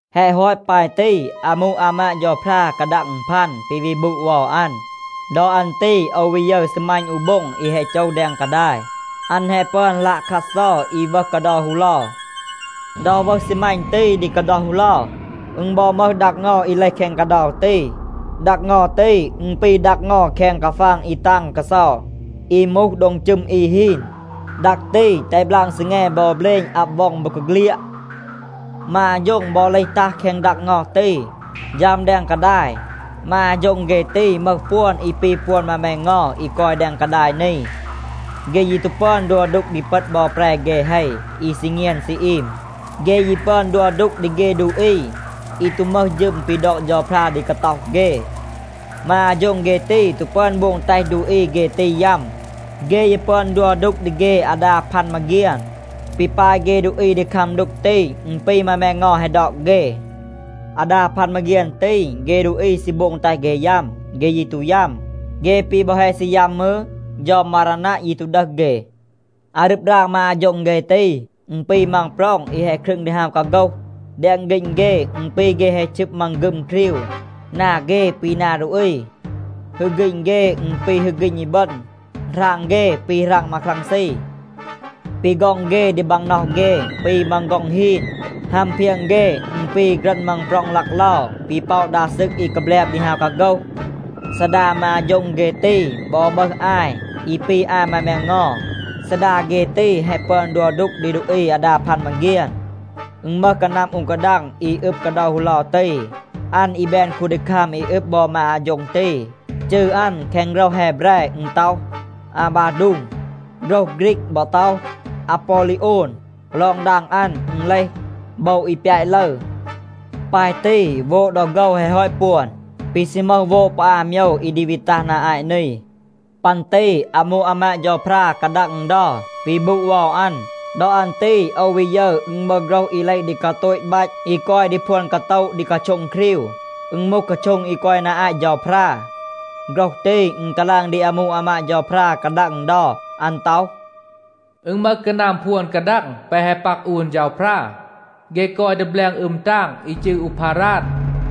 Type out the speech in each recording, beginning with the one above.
แฮะ ฮอต ปาย ตี, อามู อามาด เฌาพรา กาดัง อึณพัน ปี วี บูด เวา อัน. ดอ อัน ตี โอว วี ยึร ซีมัณ อู โบ็ง อี แฮะ โจห แดง กาดาย. อัน แฮะ ปึอน ลัะคัดเซา อี วึห กาเดา ฮูเลา. ดอ วึห ซีมัณ ตี ดี กาเดา ฮูเลา, อึณ บอ มึห ดัก เงา เลห แคง กาเดา ตี. ดัก เงา ตี, อึณ ปี ดัก เงา แคง กาฟาง อี ตาง กาเซา, อี มูห โดง จึม อี ฮีน. ดัก ตี, แตห บลาง ซีแง บอ เบลณ อับ ว็อง บอกาเฆลียด. มา อาโฌ็ง บอ เลห ตัห แคง ดัก เงา ตี, ฌัม แดง กาดาย. มา อาโฌ็ง เฆ ตี, มึห ปวน อี ปี ปวน มา แมงเงา อี กอย แดง กาดาย นี. เฆ ยี ตู ปึอน ดัว ดูก ดี เปต บอ แปร เฆ เฮ อี ซี เงียน ซี อีม. เฆ ยี ปึอน ดัว ดูก ดี เฆ ดูอี อี ตู มึห ฌึม ปี ดอก เฌาพรา ดี กาต็อห เฆ. มา อาโฌ็ง เฆ ตี ตู ปึอน โบง แตห ดูอี เฆ ตี ยัม. เฆ ยี ปึอน ดัว ดูก ดี เฆ อาดา พัน มาเฆียน. ปี ปาย เฆ ดูอี ดี คัม ดูก ตี, อึณ ปี มา แมงเงา แฮะ ดอก เฆ. อาดา พัน มาเฆียน ตี, เฆ ดูอี ซี โบง แตห เฆ ยัม. เฆ ยี ตู ยัม. เฆ ปี บอ แฮะ ซี ยัม มืร, เฌา มารานัะ ยี ตู ดึห เฆ. อารึบ ราง มา อาโฌ็ง เฆ ตี, อึณ ปี มังปร็อง อี แฮะ ครึง ดี ฮาว กาโฆห. แดง ฆีณ เฆ, อึณ ปี เฆ แฮะ ชึบ มังฆึม ครีว. นา เฆ ปี นา ดูอี. ฮึก ฆีณ เฆ, อึณ ปี ฮึก ฆีณ อีบึณ. หราง เฆ, ปี หราง มาครังซี. ปี ฆ็อง เฆ ดี บางน็อห เฆ ปี มัง ฆ็อง ฮีน. ฮัม เพียง เฆ, อึณ ปี ฆรัณ มังปร็อง ลักเลา ปี ป็อะ ดา ซึก อี กาแบลบ ดี ฮาว กาโฆห. ซีดา มา อาโฌ็ง เฆ ตี บอ มึห อาย อี ปี อาย มา แมงเงา. ซีดา เฆ ตี แฮะ ปึอน ดัว ดูก ดี ดูอี อาดา พัน มาเฆียน. อึณ มึห กานัม อู กาดัง อี อึบ กาเดา ฮูเลา ตี, อัน อี แบน คูนดีคัม อี อึบ บอ มา อาโฌ็ง ตี. จืร อัน แคง โฆรห แฮแบร อึณ ต็อห, อาบาดูง. โฆรห ฆรีก บอ ต็อห, อาปอลีโอน. (ลอง ดาง อัน อึณ เลห, โบว อี ปยาต ลึร). ปาย ตี โวด ดอ โฆว แฮะ ฮอต ปวน. ปี ซี มึห โวด ปอ อา โมยว อี ดี วี ตัห นา อาต นี. ปัน ตี อามู อามาด เฌาพรา กาดัง อึณเดา วี บูด เวา อัน. ดอ อัน ตี โอว วี ยึร, อึณ มึห โฆรห อี เลห ดี กาโตต บัต อี กอย ดี พวน กาโตะ ดี กาโช็ง ครีว. อึณ มูห กาโช็ง อี กอย นา อาต เฌาพรา. โฆรห ตี, อึณ กาลาง ดี อามู อามาด เฌาพรา กาดัง อึณเดา. อัน ต็อห, “อึณ มึห กานัม พวน กาดัง แปะ แฮะ ปัก อูน เฌาพรา. เฆ กอย ดี แบลง อึม ตาง อี จืร อูพาราด.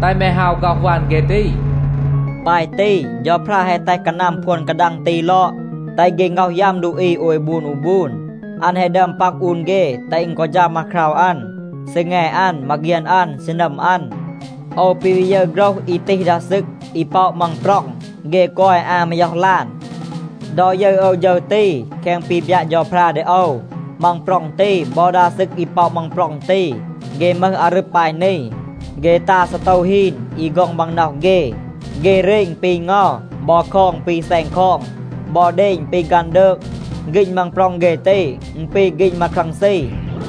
แตห แม ฮาว ฆ็อห วัน เฆ ตี.” ปาย ตี, เฌาพรา แฮะ แตห กานัม พวน กาดัง ตี ลอด, แตห เฆ ง็อห ยัม ดูอี โอย บูน อู บูน. อัน แฮะ ดึอม ปัก อูน เฆ แตห อึณ กอ ฌัม อาคราว อัน, ซีแง อัน, มาเฆียน อัน, ซีนัม อัน. โอว ปี วี ยึร โฆรห อี ตีห ดา ซึก อี ป็อะ มังปร็อง. เฆ กอย อา มาย็อห ลาน. ดอ ยึร โอว ฌึร ตี แคง ปี บยัะ เฌาพรา ดี โอว, มังปร็อง ตี บอ ดา ซึก อี ป็อะ มังปร็อง ตี, เฆ มึห อารึบ ปาย นี. เฆ ตา ซีโตว ฮีน อี ฆ็อง บางน็อห เฆ. เฆ เรณ ปี เงา บอ คอง ปี แซณ คอง บอ เดณ ปี ฆันดืก. ฆีณ มังปร็อง เฆ ตี, อึณ ปี ฆีณ มาครังซี.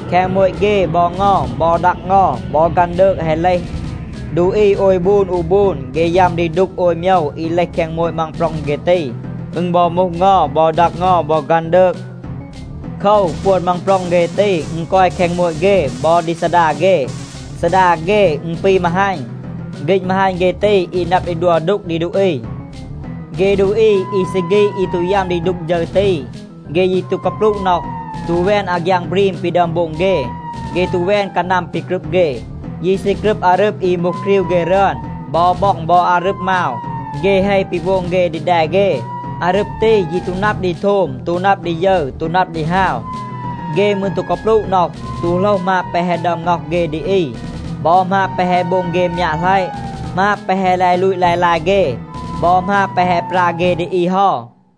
แคง โมต เฆ บอ เงา บอ ดัก เงา บอ ฆันดืก แฮะ เลห. ดูอี โอย บูน อู บูน, เฆ ยัม ดี ดูก โอย โมยว อี เลห แคง โมต มังปร็อง เฆ ตี. อึณ บอ มูห เงา บอ ดัก เงา บอ ฆันดืก. โคว, ปวน มังปร็อง เฆ ตี, อึณ กอย แคง โมต เฆ บอ ดี ซีดา เฆ. ซีดา เฆ, อึณ ปี มาฮัณ. ฆีณ มาฮัณ เฆ ตี อี นับ ดี ดัว ดูก ดี ดูอี. เฆ ดูอี อี ซี ฆีด อี ตู ยัม ดี ดูก ฌึร ตี, เฆ ยี ตู กาปลูะ น็อห, ตู แวน อาฆยาง บรีม ปี ดึอม โบง เฆ. เฆ ตู แวน กานัม ปี กรึบ เฆ, ยี ซี กรึบ อารึบ อี มูห ครีว เฆ รึอน บอ บ็อง บอ อารึบ มาว เฆ เฮ ปี โบง เฆ ดี แด เฆ. อารึบ ตี, ยี ตู นับ ดี โทม, ตู นับ ดี ยึร, ตู นับ ดี ฮาว. เฆ มืร ตู กาปลูะ น็อห, ตู โหลห หมาบ แปะ แฮะ ดึอม ง็อห เฆ ดี อี, บอ หมาบ แปะ แฮะ โบง เฆ มยัะหลัยะ, หมาบ แปะ แฮะ ลาย ลูต ลาย ลาย เฆ บอ หมาบ แปะ แฮะ ปรา เฆ ดี อี เฮา.